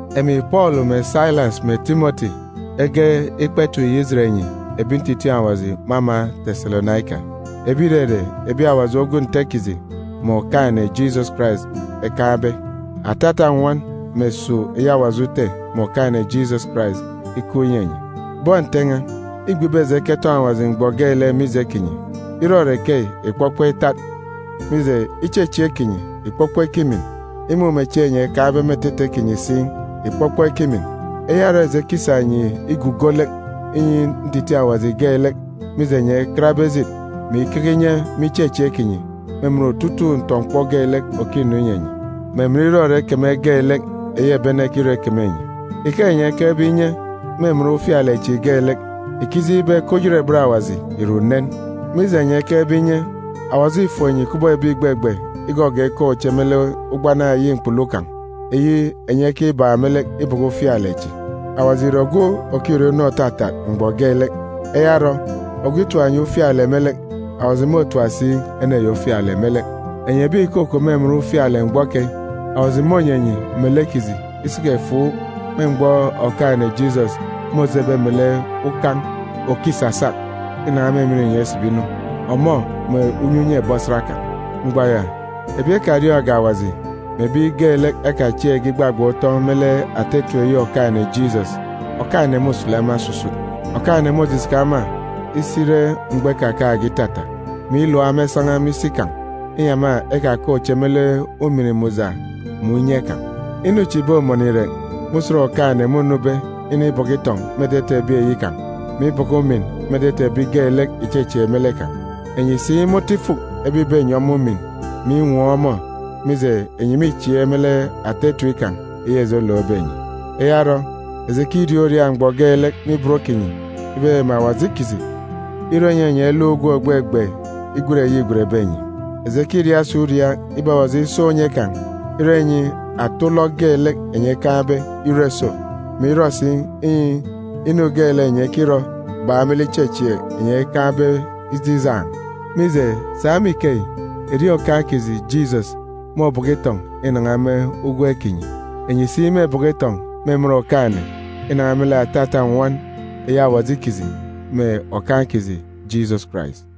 Emi Pọọlu mè Sailas mè Timọti ege ikpa etip yi ijet enyi ebi ntitiin̄ Awaji me ama Teselonaika, ebi ìrere ebi Awaji ogwu Nte kiji mè Okaan̄-ene Jisọs Karais ekaan̄be. Atata nnwọn mè esuuk eyi Awaji Ute mè Okaan̄-ene Jisọs Karais ikup inyi enyi. Bọn Nte n̄a, îgbe ibe eji eketọn̄ Awaji mgbọ geelek mije kinyi. Irọrọ ikeyi ìkpọkpọ itat, mije, ichechieek kinyi ìkpọkpọ ikimin, imumechieen̄ enyi ekaan̄be me etete kinyi si ìkpọkpọ ikimin. Eya orọ eji ekisa enyi igugo lek inyi ntitiin̄ Awaji geelek, mije enyi ekatbe ejit, mè ikeke inye me ichechieek kinyi me emen otutuuk ntọ-mkpọ geelek òkinu inyi enyi, mè emen irọrọ ikeme geelek eyi ebi ene ekirọ ikeme enyi. Ike enyi ekekebe inye me emen ufialek chi geelek, ìkijeen̄ ibe ke oyerebet Awaji ìre unen. Mije enyi ekekebe inye, Awaji îfuk enyi kubọk ebi ìgbegbe igọgọọk ikaan̄ uche me lek ugbana eyi mkpulu kan̄, eyi enyi ekibak me lek ibọkọ ufialek chi. Awaji ìre ogwu òkirọ inu òtatat mgbọ geelek. Eya orọ, ogwu itap enyi ufialek me lek, Awaji môtap si ene ya ufialek me lek. Enyi ebi ìkukup me emen ufialek mgbọ keyi, Awaji mônyi enyi melek kiji isiki-efuuk me mgbọ Okaan̄-ene Jisọs môjebe melek ukan̄ òkisasak inan̄a me emen inyọn̄ isibi inu, ọmọ melek unye unye ebi osat kan̄. Mgbọ ya, ebi ekariọọn̄ge Awaji, mè ebi geelek ekachieekge igbagban̄ utọn̄ me lek ata etip eyi Okaan̄-ene Jisọs, Okaan̄-ene môsulu ema osusut. Okaan̄-ene môjijaka ema isi ire mgbọ ikakaan̄ge itata, mè ilap ema isan̄a me isi kan̄, inyi ema ekakaan̄ uche me lek ujamgbugbo mè unye kan̄. Inu chi ìbomọnọ irek me usen Okaan̄-ene mônube inibọkọ itọn̄ me etete ebi kan̄, mè ibọkọ umin me etete ebi geelek ìchechieek me lek kan̄. Enyi si me otu ifuk ebi ìbenyi ọmọ umin mè inwọọn̄ ọmọ, mije, enyi mîchieek me lek ata etip kan̄ eyi eji elookbe enyi. Eya orọ, eji ekiriaak uriaak mgbọ geelek me ibot kinyi ibe mè Awaji kiji irọ inyi enyi eluk ugwem ògbegbe igwen eyi îgwenbe enyi. Eji ekiriaak si uriaak ibe Awaji isa unye kan̄ irọ inyi ata ulọk geelek enyi ekaan̄be irọ iso, mè irọ si inyi inu geelek enyi ekirọ bak me lek ichechieek enyi ekaan̄be ije ijaan̄. Mije, sa me ikeyi, erieen̄ Okaan̄ kiji Jisọs môbọkọ itọn̄ inan̄a me ugwem kinyi. Enyi si mêbọkọ itọn̄ me emen Okaan̄-ene inan̄a me lek atata nnwọn eyi Awaji kiji mè Okaan̄ kiji Jisọs Karais.